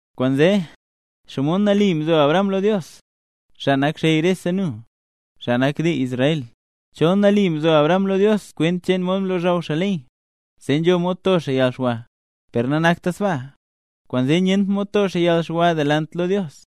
Kwaanzee, ¿xomod nali mzo Abraham lo Dios, xaa nak xey rese nu, xaa nak dii Israel? Chol nali mzo Abraham lo Dios kwent cheen mod mlozhaw xaa ley, zee nzho mod to xaa yalxwa. Per nanakta sbaa, kwaanzee nyent mod to xaa yalxwa delant lo Dios.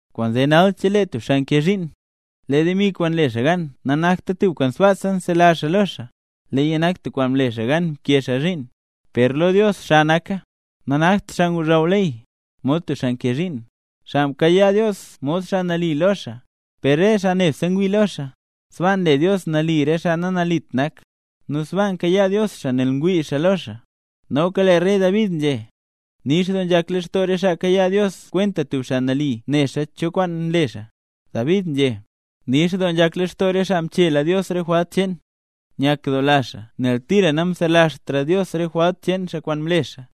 Kwaanzee nal chelee tub xaa nkee zhiin, lee demi kwaan nle xaa gan nanakta tub kwaan sbaasa nzelazh xaa lo xaa, leeya nak tub kwaan mle xaa gan mkee xaa zhiin. Per lo Dios xa naka. Nanakt xaa ngozhaw ley, mod tub xaa nkee zhiin, xaa mkayaa Dios mod xaa nali lo xaa; per re xaa nebse ngwii lo xaa, sbaa nle Dios nali re xaa nanalit nak. Nu sbaa nkayaa Dios xaa nel ngwii xaa lo xaa. Noka lee rey David nzhé, nix doo nzhak lextoo re xaa kayaa Dios kwenta tub xaa nali, nexa cho kwaan nle xaa. David nzhé: Nix doo nzhak lextoo re xaa mchela Dios re jwalt cheen; nyakdoola xaa, nel tira namselazhtra Dios re jwalt cheen xaa kwaan mle xaa.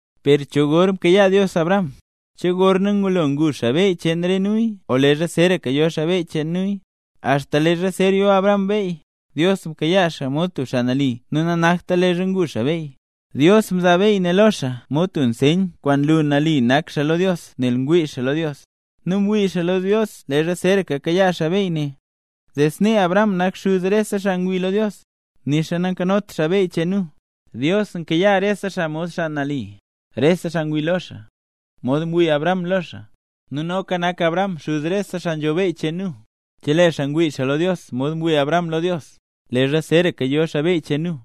Per, ¿cho gor mkayaa Dios Abraham? ¿Che gorna ngulo ngu xaa beyy cheen re nuya o leezha zeeraka yo xaa beyy cheen nuya? Axta leezha zer yo Abraham beyy, Dios mkayaa xaa mod tub xaa nali nu nanakta leezha ngu xaa beyy. Dios mzaa beyy ne lo xaa mod tub nseyn kwaan nlu nali nak xaa lo Dios nel ngwii xaa lo Dios. Nu mwii xaa lo Dios leezha zer kayaa xaa beyy ne, zee snee Abraham nak xuz rese xaa ngwii lo Dios, nixa nayot xaa beyy cheen nu. Dios nkayaa rese xaa mod xaa nali, rese xaa ngwii lo xaa, mod mwii Abraham lo xaa. Nu noka nak Abraham xuz rese xaa nzho beyy cheen nu, chelee xaa ngwii xaa lo Dios mod mwii Abraham lo Dios, leezha zeeraka yo xaa beyy cheen nu.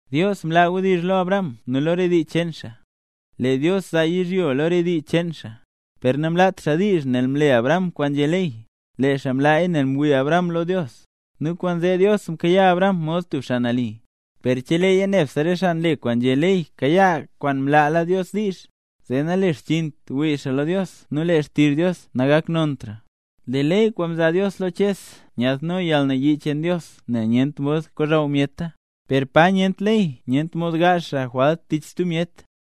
Dios mlaa wdizh lo Abraham nu lo re dii cheen xaa, lee Dios zaa yizhyo lo re dii cheen xaa. Per namlaat xaa diizh ne nel mle Abraham kwaan nzhé ley, lee xaa mlaaya nel mwii Abraham lo Dios; nu kwaanzee Dios mkayaa Abraham mod tub xaa nali. Per cheleeya nebse re xaa nle kwaan nzhé ley kayaa kwaan mlaala Dios diizh, zee nalexchiint wii xaa lo Dios nu lee xtizh Dios nagaknontra. Lee ley kwaan mzaa Dios lo Ches nyaadno yalnayii cheen Dios nel nyent mod kozhaw myeta; per pa nyent ley nyent mod ngaazh xaa jwalt tich stub myet.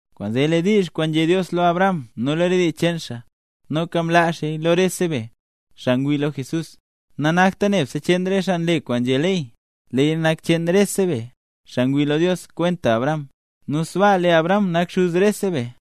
Kwaanzee, lee diizh kwaan nzhé Dios lo Abraham nu lo re dii cheen xaa, nu noka mlaa xaaya lo rese be, xaa ngwii lo Jesús. Nanakta nebse cheen re xaa nle kwaan nzhé ley, leeya nak cheen rese be, xaa ngwii lo Dios kwenta Abraham. Nu sbaa lee Abraham nak xuz rese be.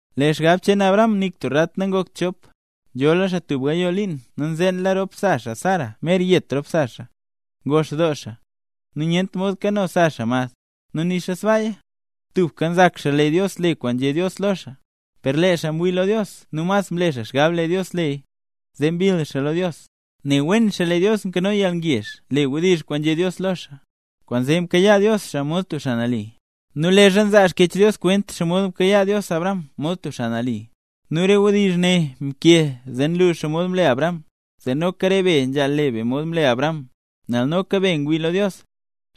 Lee xgab cheen Abraham nik tub rat nangokt chop. Nzhola xaa tub gayoo liin nu nzeenla rop sa xaa Sara mer yet rop sa xaa, nu ngox doo xaa, nu nyent mod kano sa xaa mad. Nu nixa sbaaya, tubka nzak xaa lee Dios le kwaan nzhé Dios lo xaa. Per lee xaa mwii lo Dios nu mas mle xaa xgab lee Dios leya, zee mbill xaa lo Dios. Ne wen xaa lee Dios nkano yalngezh le wdizh kwaan nzhé Dios lo xaa. Kwaanzee mkayaa Dios xaa mod tub xaa nali. Nu leezha nzaa Xkyech Dios kwent xomod mkayaa Dios Abraham mod tub xaa nali, nu re wdizh ne mkee zee nlu xomod mle Abraham; zee noka re be nzhaal le be mod mle Abraham. Nel noka be ngwii lo Dios,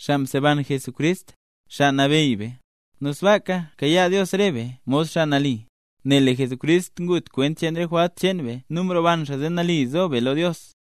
xaa mseban Jesucrist, Xaa Nabeyy be, nu sbaaka nkayaa Dios re be mod xaa nali, nel lee Jesucrist ngut kwent cheen re jwalt cheen be nu mroban xaa zee nali zo be lo Dios.